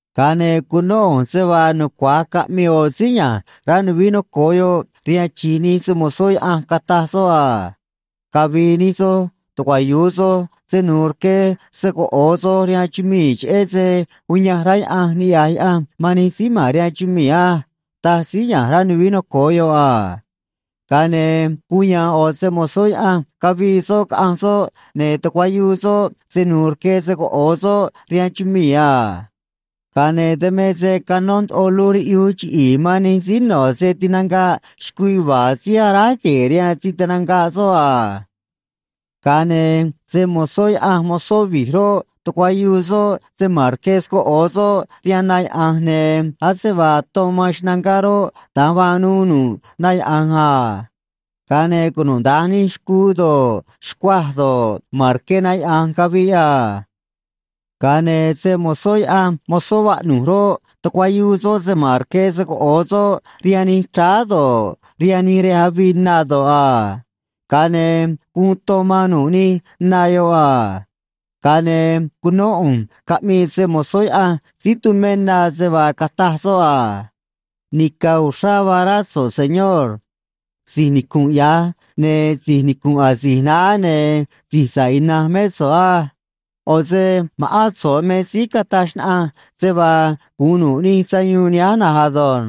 Ga̱a ne̱ cunó ꞌu̱nj se vaa nucua̱j caꞌmii ꞌo̱ síí ya̱nj rá nuvií noco̱o yoꞌ rihaan chi̱j nij se‑mo̱zó Yaꞌanj, cataj soꞌ a: ―Cavi̱i̱ nij soj, tucuayu̱u soj se nu̱u̱ rque se‑coꞌo̱o soj rihaan chumii̱, cheꞌé se uyanj rá Yaꞌanj niꞌya̱j Yaꞌanj man nij síí ma̱n rihaan chumii̱ á ―taj síí ya̱nj rá nuvií noco̱o yoꞌ a. Ga̱a ne̱ guun ya̱a̱n ꞌo̱ se‑mo̱zó Yaꞌanj, cavii soꞌ caꞌanj soꞌ, ne̱ tucuayuu soꞌ se nu̱u̱ rque se‑coꞌo̱o soꞌ rihaan chumii̱ a. Ga̱a ne̱ dan me se canó ndoꞌo luj riꞌyuj chiꞌi̱i̱ man nij síí no̱ se‑taꞌnga̱ꞌ xcuu yuva̱a̱ síí aráj gue̱e̱ rihaan se tinanga̱ꞌ soꞌ a. Ga̱a ne̱ se‑mo̱zó Yaꞌanj mozó vi̱j roꞌ, tucuayuu soꞌ se ma̱n rque se‑coꞌo̱o soꞌ rihaan na yaꞌa̱nj, ne̱ ase vaa ton man xnangá roꞌ, da̱nj vaa nuu nu̱ꞌ na yaꞌa̱nj a. Ga̱a ne̱ cunuda̱nj nij xcuu do̱ꞌ, xcuaj do̱ꞌ, ma̱n rque na yaꞌa̱nj caviꞌ a. Ga̱a ne̱ se‑mo̱zó Yaꞌanj mozó vaꞌnu̱j roꞌ, tucuayuu soꞌ se ma̱n rque se‑coꞌo̱o soꞌ rihaan nij chráá do̱ꞌ, rihaan nij rej avii na do̱ꞌ a. Ga̱a ne̱ guun ton man nu̱ꞌ nij na yoꞌ a. Ga̱a ne̱ cunó ꞌu̱nj caꞌmii se‑mo̱zó Yaꞌanj síí tumé na, se vaa cataj soꞌ a: ―Nica̱ uxrá vaa rá so̱ꞌ, Señor. Si̱j nicu̱nꞌ ya̱j, ne̱ si̱j nicu̱nꞌ asi̱j naá, ne̱ Si̱j Sa̱ꞌ Ina̱nj mé so̱ꞌ á. ꞌO̱ se ma̱ꞌán so̱ꞌ me síí cataj xnaꞌanj se vaa gu̱un nu̱ꞌ nij sayuun nihánj na̱nj ado̱nj.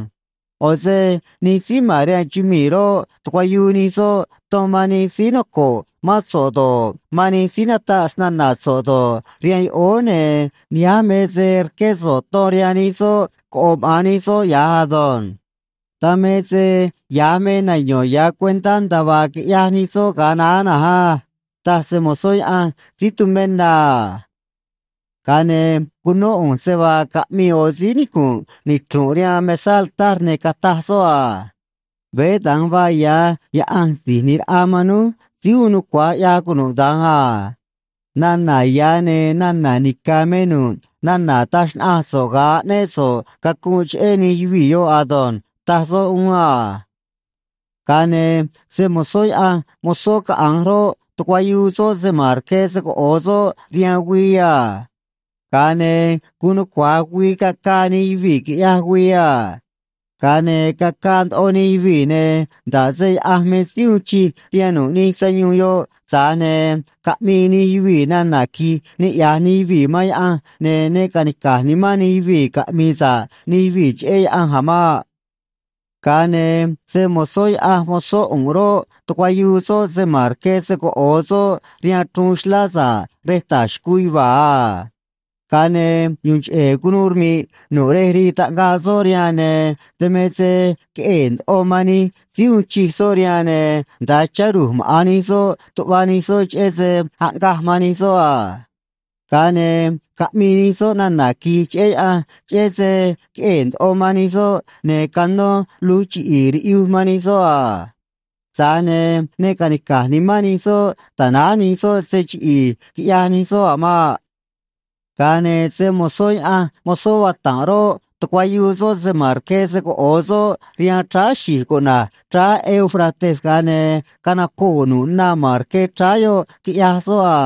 ꞌO̱ se nij síí ma̱n rihaan chumii̱ roꞌ, tucuayuu nij soꞌ ton man nij síí noco̱ꞌ mán so̱ꞌ do̱ꞌ, man nij síí nataꞌ snana̱ so̱ꞌ do̱ꞌ, rihaan yoꞌóó, ne̱ nihánj me se rqué so̱ꞌ ton rihaan nij soꞌ coꞌo̱ maꞌa̱n nij soꞌ ya̱j ado̱nj. Dan me se ya̱j me nayo̱n ya̱ cuentá nda̱a vaa quiꞌyaj nij soꞌ ga̱a naá na̱nj á ―taj se‑mo̱zó Yaꞌanj síí tumé na a. Ga̱a ne̱ cunó ꞌu̱nj se vaa caꞌmii ꞌo̱ síí nicu̱nꞌ nichru̱nꞌ rihaan mesá altar, ne̱ cataj soꞌ a: ―Veé da̱nj vaa ya̱, Yaꞌanj Si̱j ꞌNi̱j Raꞌa man núj, Síí Uun Nucua̱j ꞌYaj Cunuda̱nj a. Nana̱ ya̱ ne̱ nana̱ nica̱ me nu̱ꞌ nana̱ taj xnaꞌanj so̱ꞌ ga̱a aꞌnéꞌ so̱ꞌ cacunꞌ cheꞌé nij yuvii̱ yoꞌ ado̱nj ―taj soꞌ uún a. Ga̱a ne̱ se‑mo̱zó Yaꞌanj mozó caꞌa̱nj roꞌ, tucuayuu soꞌ se ma̱n rque se‑coꞌo̱o soꞌ rihaan güii a. Ga̱a ne̱ guun nucua̱j güii cacaa nij yuvii̱ quiꞌyaj güii a. Ga̱a ne̱ cacaa ndoꞌo nij yuvii̱, ne̱ nda̱ꞌ se Yaꞌanj me síí uun chij rihaan nu̱ꞌ nij sayuun yoꞌ, tza̱j ne̱ caꞌmii nij yuvii̱ nana̱ qui̱j niꞌya̱j nij yuvii̱ man Yaꞌanj, ne̱ ne ca̱nica̱j nimán nij yuvii̱ caꞌmi̱i̱ sa̱ꞌ nij yuvii̱ cheꞌé Yaꞌanj a̱ maꞌ. Ga̱a ne̱ se‑mo̱zó Yaꞌanj mozó ꞌu̱nꞌ roꞌ, tucuayuu soꞌ se ma̱n rque se‑coꞌo̱o soꞌ rihaan chruun xlá sa̱ꞌ rej ta̱j xcuu yuva̱a̱ a. Ga̱a ne̱ yu̱u̱n cheꞌe̱ cunuu rmi̱ꞌ nu̱ꞌ rej rii taꞌngaꞌ soꞌ rihaan, ne̱ dan me se queꞌee̱ ndoꞌo man nij síí uun chij soꞌ rihaan, ne̱ nda̱a chá ru̱j maꞌa̱n nij soꞌ tuꞌva nij soꞌ cheꞌé se aꞌngaj man nij soꞌ a. Ga̱a ne̱ caꞌmii nij soꞌ nana̱ qui̱j cheꞌé Yaꞌanj, cheꞌé se queꞌee̱ ndoꞌo man nij soꞌ ne̱ canó luj chiꞌi̱i̱ riꞌyuj man nij soꞌ a. Tza̱j ne̱ ne ca̱nica̱j nimán nij soꞌ ta̱náj nij soꞌ se chiꞌi̱i̱ quiꞌyaj nij soꞌ a̱ maꞌ. Ga̱a ne̱ se‑mo̱zó Yaꞌanj mozó vata̱nꞌ roꞌ, tucuayuu soꞌ se ma̱n rque se‑coꞌo̱o soꞌ rihaan chráá xi̱j cuꞌna̱j chráá Éufrates, ga̱a ne̱ canacoo̱ nu̱ꞌ na ma̱n rque chráá yoꞌ, quiꞌyaj soꞌ a.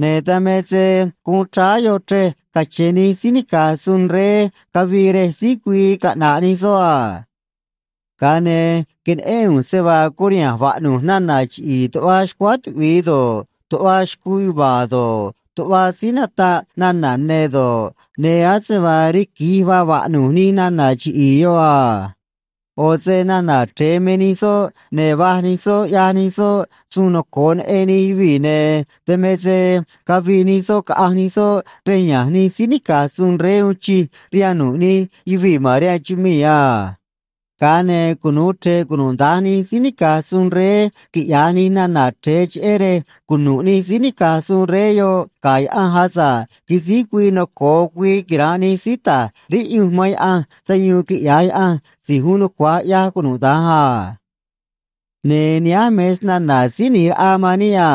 Ne̱ dan me se guun chráá yoꞌ chrej cache̱n nij síí nica̱j suun rey cavii rej síj güii caꞌna̱ꞌ nij soꞌ a. Ga̱a ne̱ queneꞌén ꞌu̱nj se vaa curiha̱nj vaꞌnu̱j nana̱ chiꞌi̱i̱ tuꞌva xcuáá tuꞌvi̱i do̱ꞌ, tuꞌva xcuu yuva̱a̱ do̱ꞌ, tuꞌva síí nataꞌ nana̱ ne̱ do̱ꞌ, ne̱ ase vaa riqui̱j vaa vaꞌnu̱j nij nana̱ chiꞌi̱i̱ yoꞌ a. ꞌO̱ se nana̱ chre̱e me nij soꞌ, ne̱ va̱j nij soꞌ ꞌyaj nij soꞌ suun noco̱o neꞌen nij yuvii̱, ne̱ dan me se cavii nij soꞌ caꞌanj nij soꞌ rej ya̱nj nij síí nica̱j suun rey uun chij rihaan nu̱ꞌ nij yuvii̱ ma̱n rihaan chumii̱ a. Ga̱a ne̱ cunu̱u chre̱ꞌ cunuda̱nj nij síí nica̱j suun rey, quiꞌya̱j nij nana̱ chre̱e, cheꞌé rej cunu̱ꞌ nij síí nica̱j suun rey yoꞌ ga̱ Yaꞌanj asa̱ꞌ quisíj güii noco̱o güii quira̱nꞌ nij síí ta̱j riꞌyunj man Yaꞌanj sayuun quiꞌya̱j Yaꞌanj Si̱j Uun Nucua̱j ꞌYaj Cunuda̱nj a. Ne̱ nihánj me snana̱ Síí ꞌNi̱j Raꞌa man níꞌ a: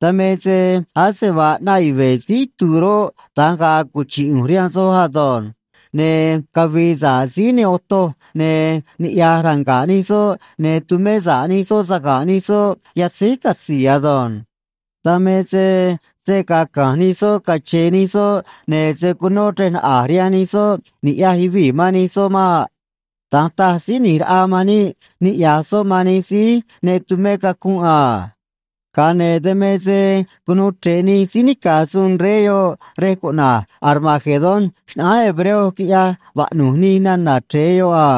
“Dan me se ase vaa ꞌnaꞌ yuve̱ síí itu̱u̱ roꞌ, da̱nj ga̱a̱ cuchi̱ꞌ ꞌu̱nj rihaan soj ado̱nj. Ne̱ cavi̱i̱ sa̱ꞌ síí ne otoj, ne̱ niꞌya̱j ranga̱ꞌ nij soꞌ, ne̱ tumé sa̱ꞌ nij soꞌ saga̱nꞌ nij soꞌ yatzéj catzi̱i̱ ado̱nj. Dan me se se̱ gaa ca̱nj nij soꞌ cache̱e̱ nij soꞌ, ne̱ se̱ cunó chrej naꞌa̱j rihaan nij soꞌ ni̱ꞌyaj yuvii̱ man nij soꞌ maꞌ.” Da̱nj taj Síí ꞌNi̱j Raꞌa man níꞌ niꞌya̱j soꞌ man nij síí ne tumé cacunꞌ a. Ga̱a ne̱ dan me se cunuu chre̱ꞌ nij síí nica̱j suun rey yoꞌ rej cuꞌna̱j Armagedón xnaꞌánj hebreo, quiꞌyaj vaꞌnu̱j nij nana̱ chre̱e yoꞌ a.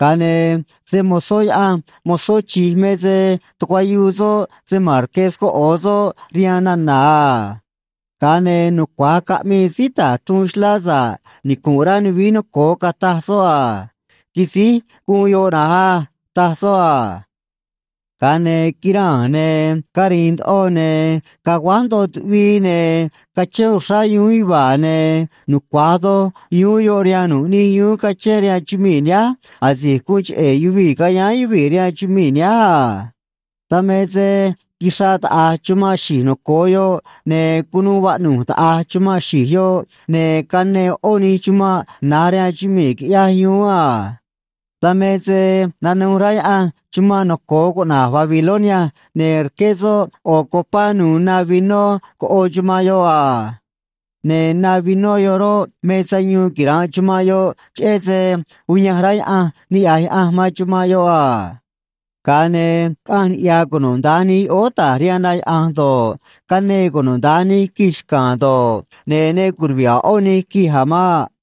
Ga̱a ne̱ se‑mo̱zó Yaꞌanj mozó chi̱j me se tucuayuu soꞌ se ma̱n rque se‑coꞌo̱o soꞌ rihaan nana̱ a. Ga̱a ne̱ nucua̱j caꞌmii síí ta̱j chruun xlá sa̱ꞌ nicu̱nꞌ rá nuvií noco̱o, cataj soꞌ a: ―Quisíj guun yoꞌ na̱nj á ―taj soꞌ a. Ga̱a ne̱ quiraa̱n, ne̱ cari̱i̱n ndoꞌo, ne̱ caguáj ndoꞌo tuꞌvii, ne̱ cachén uxrá yuún yuva̱a̱, ne̱ nucua̱j doj yuún yoꞌ rihaan nu̱ꞌ nij yuún cachén rihaan chumii̱ nihánj asi̱j guun cheꞌe̱ yuvii̱ cayáán yuvii̱ rihaan chumii̱ nihánj a. Dan me se quixraꞌ taꞌa̱j chumanꞌ xi̱j noco̱o yoꞌ, ne̱ cunuu vaꞌnu̱j taꞌa̱j chumanꞌ xi̱j yoꞌ, ne̱ canee ꞌó nij chumanꞌ na̱j rihaan chumii̱, quiꞌyaj yuún a. Dan me se nanuj rá Yaꞌanj chumanꞌ noco̱o cuꞌna̱j Babilonia, ne̱ rqué soꞌ ꞌo̱ copá nu̱u̱ na vinó coꞌo̱ chumanꞌ yoꞌ a. Ne̱ na vinó yoꞌ roꞌ, me sayuun quira̱nꞌ chumanꞌ yoꞌ, cheꞌé se uyanj rá Yaꞌanj niꞌya̱j Yaꞌanj man chumanꞌ yoꞌ a. Ga̱a ne̱ caꞌanj niꞌya̱ cunuda̱nj nij yoꞌóó ta̱j rihaan na yaꞌa̱nj do̱ꞌ, canee cunuda̱nj nij quij xca̱a̱n do̱ꞌ, ne̱ ne curuvi̱ꞌ a̱ ꞌó nij quij a̱ maꞌ.